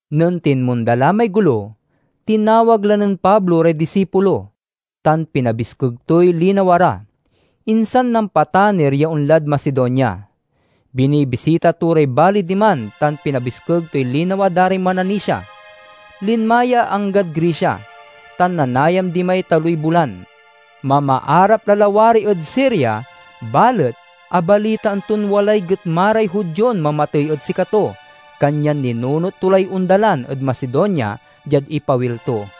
Nen tinmonda la may golo, tinawag la nen Pablo ray disipulo, tan pinabiskeg toy linawa ra. Insan nampatanir ya onlad Macedonia. Binibisita to ray baley diman tan pinabiskeg toy linawa da ray mananisia. Linma ya anggad Grecia, tan nanayam dimay taloy bulan. Mamaarap la lawari ed Siria, balet abalitaan ton walay getma ray Judion mamatey ed sikato, kanyan ninunot to lay ondalan ed Macedonia diad ipawil to.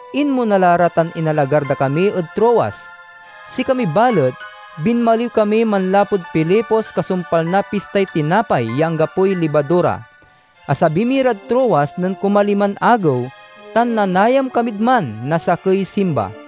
Inmona la ra tan inalagar da kami ed Troas. Sikami balet, binmaliw kami manlapud Filipos kasumpal na Pistay Tinapay ya Anggapoy Libadura. Asabi mi rad Troas nen kumaliman agew, tan nanayam kamid man sa sakey simba.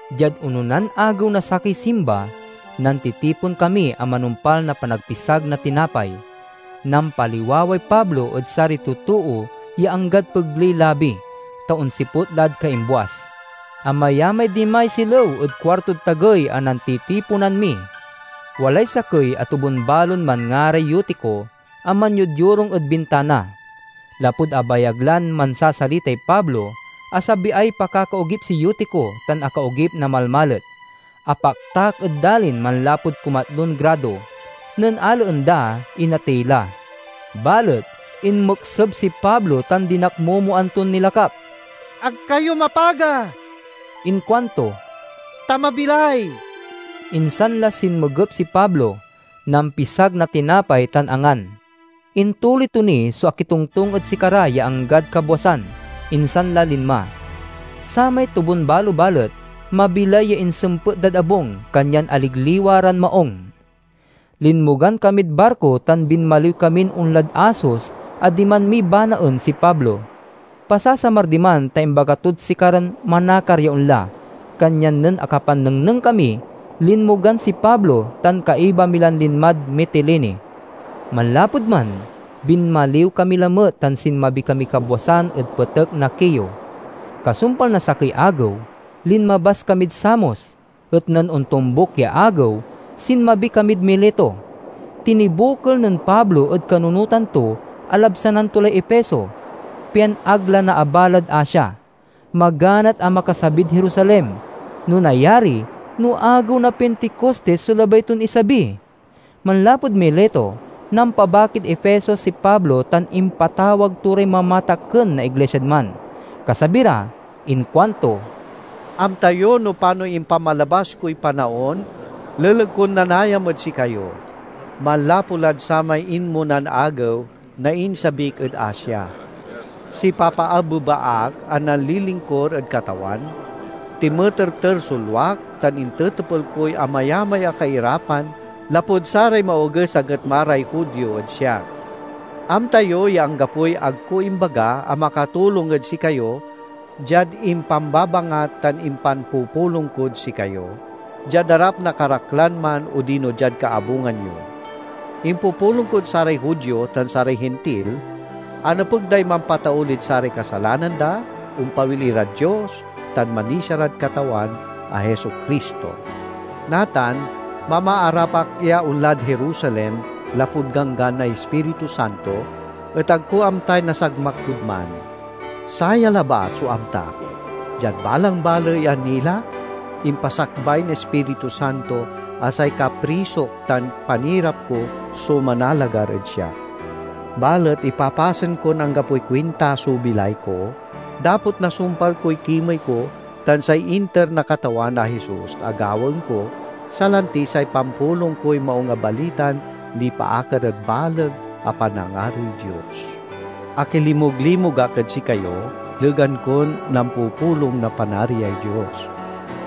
Diad ononan agew na sakey simba, nantitipon kami a manumpal na panagpisag na tinapay. Nampaliwaway Pablo ed saray totoo ya anggad pegley labi, ta onsiput lad kaimbuas. Amayamay dimay silew ed kuartod tagey a nantitiponan mi. Walay sakey a tobun-balon manngaray Eutico, a manyodyorung ed bintana. Lapud abayag lan mansasalitay Pablo, asabiay pakakaogip si Eutico tan akaogip na malmalet. Apaktak ed dalin manlapud kumatlon grado. Nen alaen da, inatey la. Balet inmekseb si Pablo tan dinakmomoan ton nilakap. "Ag kayo mapaga," inkuanto, "ta mabilay!" Insan la sinmegep si Pablo, nampisag na tinapay, tan angan. Intuloy to ni so akitongtong ed sikara ya anggad kabwasan, insan la linma. Samay tobunbalo balet, mabilay ya insempet dad abung, kanyan aligliwa ran maung. Linmogan kamid barko tan binmaliw kamin onlad Assos a diman mi banaen si Pablo. Pasasamar diman, ta imbaga tod sikaran manakar ya onla. Kanyan nen akapannengneng kami, linmogan si Pablo, tan kaiba mi lan linmad Mitilene. Manlapud man binmaliw kami lamet tan sinmabi kamiy kabwasan ed petek na Quio. Kasumpal na sakey agew, linmabas kamid Samos, et nen ontombuk ya agew sinmabi kamid Mileto. Tinibokel nen Pablo ed kanunotan to a labsanan to lay Efeso, pian ag la naabalad Asia. Maganat a makasabid Jerusalem; no nayari, no agew na Pinticostis so labay ton isabi. Manlapud Mileto, nampabakid Efeso si Pablo tan impatawag to ray mamatakken na iglisiad man. Kasabi ra inkuanto, "Amta yo no panoy impamalabas koy panaon leleg kon nanayam ed sikayo, manlapu lad samay inmonan agew na insabik ed Asia. Sipapaabeba ak a nanlilingkur ed Katawan, tinmeterter so luak, tan intetepel koy amayamay a kairapan lapud saray maoges a getma ray Judio ed siak. Amta yo ya anggapoy ag ko imbaga a makatulong ed sikayo diad impambabangat tan impanpupulong kod sikayo, diad arap na karaklan man odino diad kaabungan yo. Impupulong kod saray Judio tan saray Hintil a nepeg day mampataulid saray kasalanan da, ompawil irad Dios, tan manisia rad Katawan a Jesu-Cristo. Natan, mamaarap ak ya onlad Jerusalem lapud ganggan na Ispiritu Santo, et ag ko amtay nasagmak kod man. Saya labat so amtak: diad balang baley a nilak, impasakbay na Ispiritu Santo a say kaprisok tan panirap ko so manalagar ed siak. Balet ipapasen kon anggapoy kuinta so bilay ko, dapot nasumpal koy kimey ko tan say inter na Katawan a Jesus a gawaen ko, salanti, say pampulong koy Maung a Balitan nipaakar ed baleg a panangaroy Dios. "Akilimug-limug ak ed sikayo, legan kon nampupulong na Panariay Dios.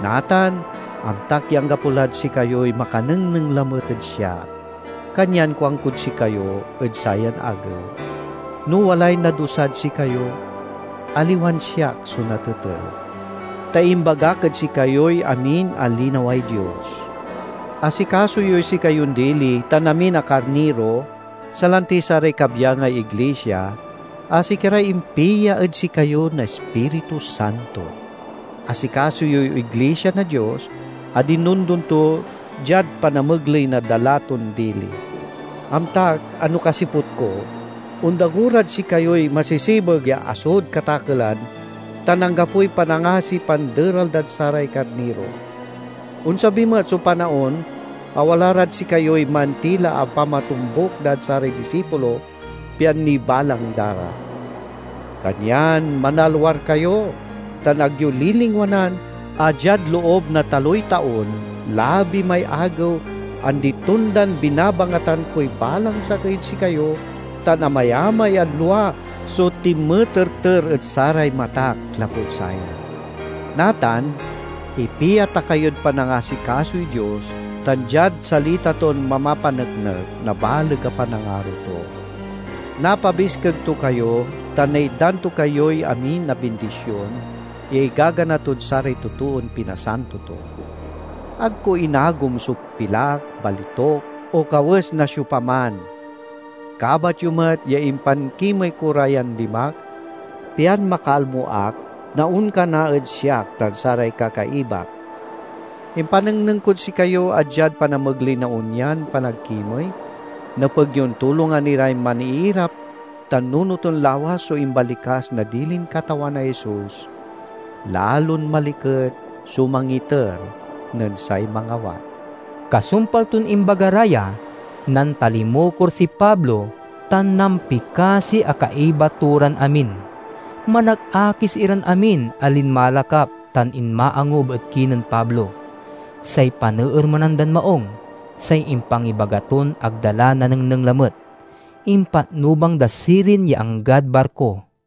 Natan, amtak ya anggapo lad sikayoy makanengneng lamet ed siak. Kanyan kuankod sikayo ed sayan agew: no walay nadusad sikayo, aliwan siak so natetel. Ta imbagak ed sikayoy amin a linaway Dios. Asikaso yoy sikayon dili tan amin a karniro, salanti saray kabyangay iglisia a sikaray impia ed sikayo na Ispiritu Santo. Asikaso yoy iglisia na Dios a dinondon to diad panamegley na dala ton dili. Amtak a no kasiput ko, ondago rad sikayoy masesebeg ya asod katakelan tan anggapoy panangasiy panderal dad saray karniro. Onsabi met so panaon a wala rad sikayoy mantila a pamatombuk dad saray disipulo, pian nibalang da ra. Kanyan manalwar kayo, tan ag yo lilingwanan a diad loob na taloy taon, labi may agew, andi-tondan binabangatan koy balang sakey ed sikayo, tan amayamay a lua so tinmeterter ed saray matak lapud saya. "Natan, ipia ta kayod panangasikasoy Dios tan diad salita ton mamapaneknek na baleg a panangaro to. Napabiskeg to kayo tan naitdan to kayoy amin a bindision ya igagana tod saray totoon pinasanto to. Ag ko inagom so pilak, balituk, o kawes na siopaman. Kabat yo met ya impankimey ko ra yan limak, pian makalmo ak na onkana ed siak tan saray kakaibak. Impanengneng kod sikayo a diad panamegley na onyan panagkimey, nepeg yon tulongan iray maniirap tan nunoten lawas so imbalikas na dilin Katawan a Jesus, 'Lalon maliket so mangiter nen say mangawat.'" Kasumpal ton imbaga ra ya, nantalimukor si Pablo tan nampikasi a kaiba to ran amin. Manakakis iran amin a linmalakap tan inmaangub ed kinen Pablo. Say paneermenan dan maung say impangibaga ton ag da la nanengneng lamet. Impatnubang da sirin ya anggad barko.